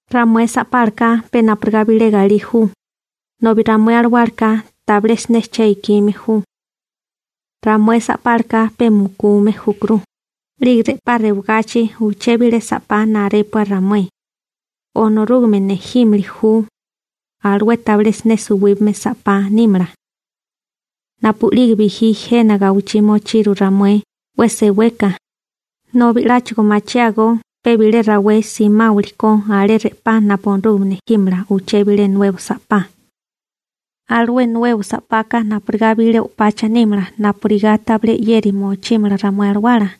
Ramué sa'pálaka pe napurigá bilé galí ju, nobi ramué alawálaka tabilé siné che ikime júkó. Ramué sa'pálaka pe mukume júkuru, 'lige re'pá rewagachi uché bilé sa'pá narépua ramué, Onorúgame nejímili ju. Alué tabilé siné suwíbame sa'pá nímala. Napu'lige bijí jena gawichí mochiru ramué 'we seweka ejperégame niru, nobi 'láchigo machiágó pe bilé rawé simáwilikó alé re'pá napu Onorúgame nejímala uché bilé nuebo sa'pá. Alué nuebo sa'paka napurigá bilé o'pacha nímala napurigá tabilé 'yeri mochímala ramué alawala.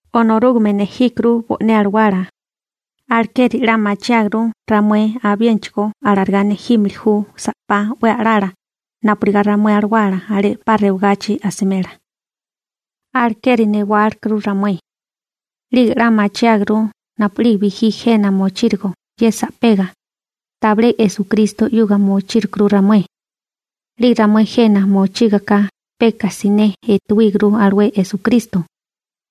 Onorúgame nejíkuru bo'né alawala, alekeri 'la machiáguru ramué, abiénachigo alarigá nejímili ju sa'pá 'we a'lala napurigá ramué alawala alé re'pá rewagachi mochímala. Alekeri newálikuru ramué. 'Lige 'la machiáguru napu'lige bijí jena mochírigo ye sa'pega, tabilé Esukristo 'yuga mochírikuru ramué. 'Lige ramué jena mochígaká peka siné etuwíguru alué Esukristo,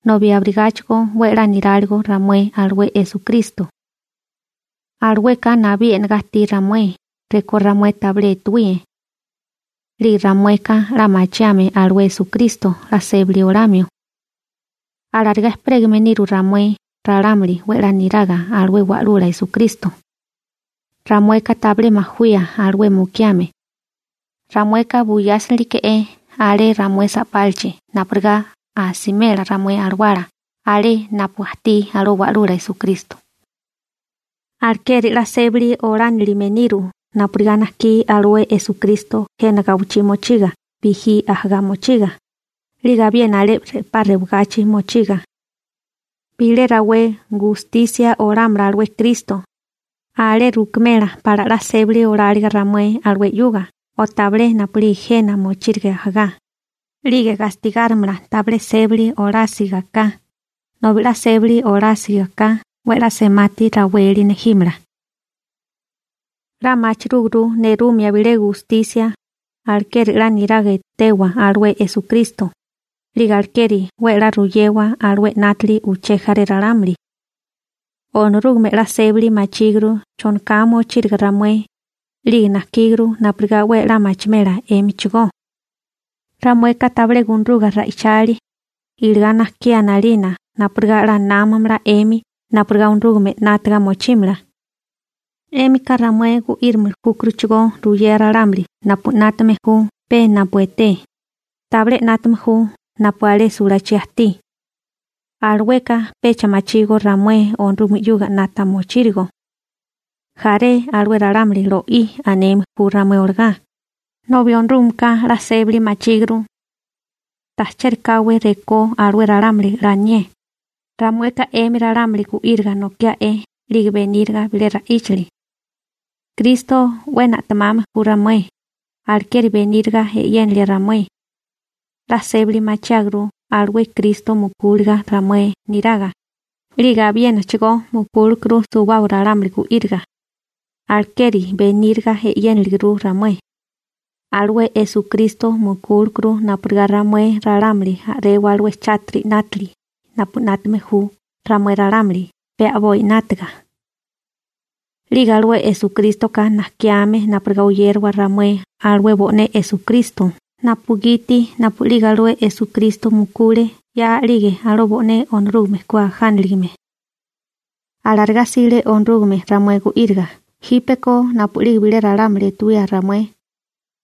nobi abirigáchigo 'we a'lá niráligo ramué alué Esukristo. Alueka nabí e'negá ajtí ramué rekó ramué tabilé etuwíe. 'Lige ramueka 'la machiame alué Esukristo 'la sébali olamio. Alarigá ejperégame niru ramué ralámuli 'we 'la niraga alué Wa'lula Esukristo. Ramueka tabilé majawía alué mukiame. Ramueka buyásinilike'é alé ramué sa'pálachi napurigá 'a simela ramué alawala alé napu ajtí alué Wa'lula Esukristo. Alekeri 'la sébali olánilime niru napurigá najkí alué Esukristo jena gawichí mochiga bijí ajagá mochiga 'lige abiena alé re'pá rewagachi mochiga. Bilé rawé gatémala alué Kristo ramué 'yuga (gustisia olámala), alé rukimela pala 'la sébali oláliga ramué alué 'yuga o tabilé napu'lige jena mochírige ajagá, 'lige gastigárimala tabilé sébali olásiga ka, nobi 'la sébali olásiga ka 'we a'lá semati raweli nejímala. 'La machirúguru nerumia bilé gustisia, alekeri 'la niraga etewa alué Esukristo, 'lige alekeri 'we 'la ruyewa alué 'nátili uché jaré ralámuli. Onorúgame 'la sébali machíguru chonoká mochíriga ramué, 'lige najkíguru napurigá 'we a'lá machimela 'émichigó. Ramueka tabilé gunaruga ra'ichalia, iligá najkiá 'nalina napurigá 'la námamala 'emi napurigá Onorúgame 'nátaga mochímala. 'Émika ramué gu'írimili júkuruchigó ruyea ralámuli napu 'nátame ju pe napu etee, tabilé 'nátame ju napu alé sulachí ajtí. Alueka pecha machígó ramué Onorúgame 'yuga 'nata mochírigo. Jaré alué ralámuli lo'í aneme ju ramué olagá, nobi Onorúgameka 'la sébali machíguru. Ta chérikáwé rekó alué ralámuli 'la anié, ramueka 'emi ralámuli gu'íriga nokia'e 'lige beníriga bilé ra'íchali. Kristo 'we na'temame ju ramué, alekeri beníriga e'yénilia ramué. 'La sébali machiáguru alué Kristo mukúliga ramué neraga, 'lige abiénachigó mukúlekuru suwábaga ralámuli gu'íriga. Alekeri beníriga e'yéniliguru ramué. Alué Esukristo mukúlekuru napurigá ramué ralámuli a'rewa alué chátiri 'nátili, napu 'nátame ju ramué ralámuli pe a'boi 'nátaga. 'Lige alué Esukrístoka najkiame napurigá oyérawa ramué alué bo'né Esukristo napugiti napu'lige alué Esukristo mukule 'ya 'lige alué bo'né Onorúgame ku ajániligame. Alarigá 'sile Onorúgame ramué gu'íriga. Jípeko napu'lige bilé ralámuli etuwía ramué,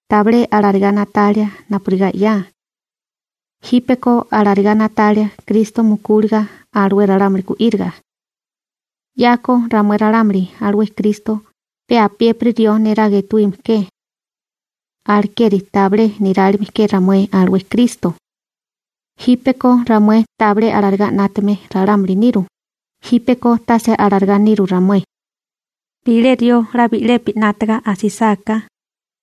tabilé alarigá na'talia napurigá 'ya. Jípeko alarigá na'talia Kristo mukúliga alué ralámuli gu'íriga. 'Yako ramué ralámuli alué Kristo pe apiépiri rió neraga etuíme ke. Alekeri tabilé nirálime ke ramué alué Kristo. Jípeko ramué tabilé alarigá 'nátame ralámuli niru, jípeko tase alarigá niru ramué. Bilé rió 'la bi'lepi 'nátaga asisáká,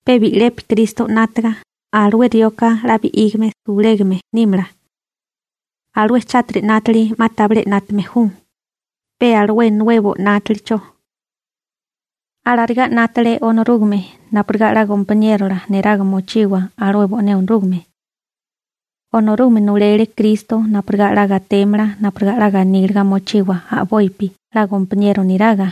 pe bi'lepi Kristo 'nátaga, alué rioka 'la bi'ígame sulégame nímala. Alué chátiri 'nátili 'ma tabilé 'nátame ju, pe alué nuebo 'nátalicho. Alarigá 'nátale Onorúgame napurigá 'la gompaniérola neraga mochiwa alué bo'né Onorúgame. Onorúgame nulele Kristo napurigá 'la gatémala napurigá 'la ganíliga mochiwa a'bopi 'la gompaniero niraga.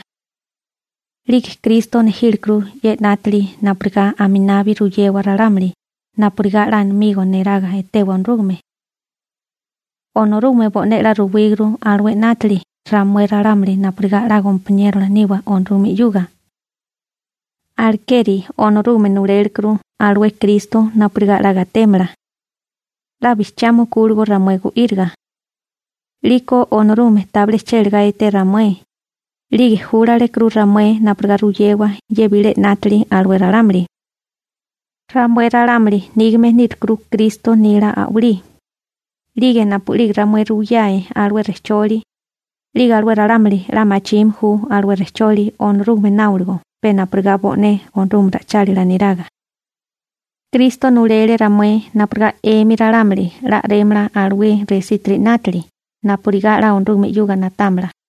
'Lige Kristo nejílekuru ye 'nátili napurigá aminabi ruyewa ralámuli napurigá 'la amigo niraga etewa Onorúgame. Onorúgame bo'né 'la ruwíguru alué 'nátili ramué ralámuli napurigá 'la gompaniérola niwa Onorúgame 'yuga. Alekeri Onorúgame nulélekuru alué Kristo napurigá 'la gatémala. 'La bijchiá mukúligo ramué gu'íriga, 'liko Onorúgame tabilé chélegá eté ramué, 'lige julárukuru ramué napurigá ruyewa ye bilé 'nátili alué ralámuli. Ramué ralámuli nígame nírukuru Kristo nila a'walí, 'lige napu'lige ramué ruwiyae alué rejcholi, 'lige alué ralámuli 'la machime ju alué rejcholi Onorúgame náoligo pe napurigá bo'né Onorúgame ra'ichálila niraga. Kristo nulele ramué napurigá 'emi ralámuli 'la a'rémala alué resítiri 'nátili napurigá 'la Onorúgame 'yuga na'támala.